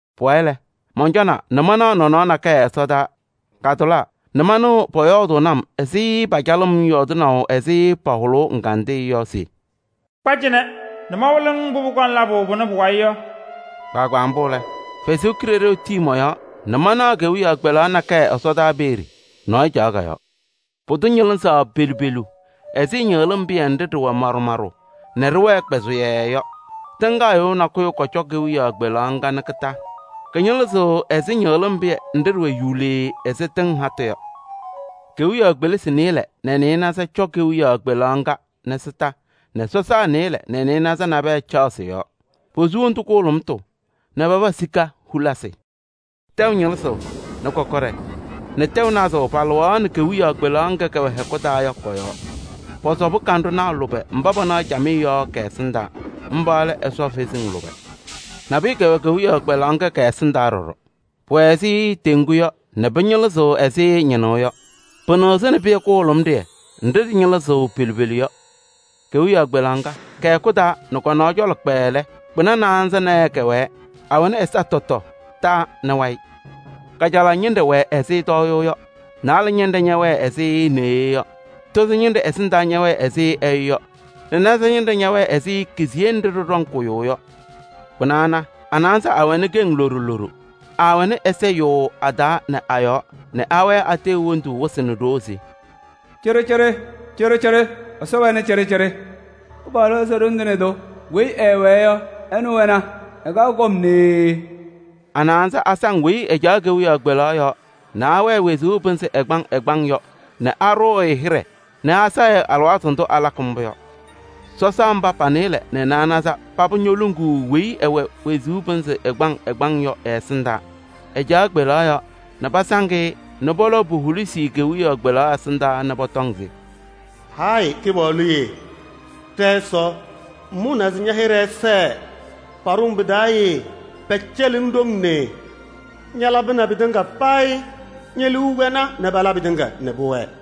Pʋwayɩ lɛ, mɔncɔna nɛ manaɣ nɔnɔɔ nakɛyɛ ɛsɔdaa, katʋlaa nɛ manɩɣ pʋyɔɔdʋʋnɩ-m ɛzɩ pɩcalʋʋ-m yɔɔdɩnaʋ ɛzɩ pahʋlʋʋ ɛgandɩyɛ yɔ se: “Kpa cɩnɛ nɛ mawɩlɩ-ŋ mbʋ pʋkɔŋ labʋ pʋnɛ pʋ-wayɩ yɔ.” Kpaagbaa mbʋ lɛ, Ɛsɔ Kalɩzaɣ tii mɔ-yɔɔ nɛ manaɣ kewiyaɣ kpelaɣ nakɛyɛ ɛsɔdaa peeye. Nɔɔyʋ caɣ kɔ-yɔɔ. Pʋdʋ ñɩlɩzaɣ pelu pelu ɛzɩ ñɩɣlɩm pɩyɛ nɖɩ ɖɩwɛ maɖʋ maɖʋ nɛ ɖɩwɛɛ kpʋzʋyɛɛ yɔ. Tɩŋgaɣyʋʋ nakʋyʋ kɔcɔ kewiyaɣ kpelaɣ ŋga kondiko. Kɩñɩlɩzɩɣ ɛzɩ ñɩɣlɩm pɩyɛ nɖɩ ɖɩwɛ yuulee ɛzɩ tɩŋ hatʋ yɔ. Kewiyaɣ kpelisi nɩɩlɛ nɛ naanza kɔcɔ kewiyaɣ kpelaɣ ŋga kondiko nɛ sɔsaa nɩɩlɛ nɛ naanza nabɛyɛ caɣ sɩ-yɔɔ. Posu wondu kʋhʋlʋmʋtʋ nɛ paba sika hulisi. Tɛʋ ñɩlɩzʋʋ nɛ kɔkɔɖɛ nɛ tɛʋ nazʋʋ palɩɣaɣnɩ kewiyaɣ kpelaɣ ŋga kɛwɛ hɛkʋ taa yɔ kɔ-yɔɔ. Pɔsɔbɩ kanɖʋnaa lʋbɛ mba panaɣ camɩyɛ yɔ kɛ-ɛsɩndaa: mba lɛ Ɛsɔ kalɩzasɩ lʋbɛ. Nabʋyʋ kɛwɛ kewiyaɣ kpelaɣ ŋga kɛ-ɛsɩndaa ɖɔɖɔ. Pʋwɛ ɛzɩ teŋgu yɔ nɛ pɩñɩlɩzɩɣ ɛzɩ ñɩñʋʋ yɔ. Pɩnɩɣzɩnɩ pɩyɛ kʋhʋlʋmɩyɛ nɖɩ ɖɩñɩlɩzɩɣ pelu pelu yɔ. Kewiyaɣ kpelaɣ ŋga, kɛ-hɛkʋ taa nɛ kɔ-cɔlɔ kpɛɛɛ lɛ, kpɩna naanza naayɛ kɛwɛɛ, awɛnɩ ɛza tɔtɔ, taa nɛ wayɩ. Kajalaɣ ñɩnɖɛ wɛ ɛzɩ tɔɔyʋʋ yɔ, naalɛ ñɩnɖɛ ñɛwɛɛ ɛzɩ neɣye yɔ, tozo ñɩnɖɛ ɛsɩndaa ñɛwɛɛ ɛzɩ ɛyʋ yɔ nɛ naza ñɩnɖɛ ñɛwɛɛ ɛzɩ keziye nɖɩ ɖɩɖɔŋ kʋyʋʋ yɔ. Kpɩna ana, a-naanza aawɛnɩ keŋ loɖo loɖo. Aawɛnɩ ɛza yʋʋʋ a-taa nɛ a-yɔɔ nɛ awɛɛ ateɣ hendu wɩsɩ nɛ ɖoo se: “Cɩɖɩcɩɖɩ, cɩɖɩcɩɖɩ Ɛsɔ wɛnɩ cɩɖɩcɩɖɩ. Kɩpaɣlʋ Ɛsɔ Ɖoŋ Tɩŋa Tʋ weyi ɛɛwɛɛ yɔ, ɛnʋ wɛna, ɛkaɣ kɔm nee.” A-naanza asaŋ weyi ɛcaɣ kewiyaɣ kpelaɣ yɔɔ nɛ ɛwɛɛ wezuu pɩnzɩ ɛgbaŋ ɛgbaŋ yɔ nɛ aɖʋʋ-ɩ hɩɖɛ nɛ asɛɣ-ɩ. Alɩwaatʋ ndʋ alakɩ mbʋ yɔ, sɔsaa mba pa-nɩɩlɛ nɛ naanza paba ñoluŋuu weyi ɛwɛ wezuu pɩnzɩ ɛgbaŋ ɛgbaŋ yɔ ɛ-ɛsɩndaa. Ɛcaɣ kewiyaɣ kpelaɣ yɔɔ nɛ pasaŋ-ɩ nɛ pɔlɔʋ po-hulisi kewiyaɣ kpelaɣ ɛsɩndaa nɛ pɔtɔŋ se: “Hayɩ Kɩpaɣlʋ yee, ɖɛ-Ɛsɔ, ŋmʋnaa se ña-hɩɖɛ ɛsɛɛ, paɖʋ-ŋ pɩ-taa yee pɛcɛlɩ-ŋ ɖoŋ nee. Ñalabɩnɩ pɩtɩŋa payɩ ñe-liu wɛna nɛ pala pɩtɩŋa nɛ pʋwɛɛ.”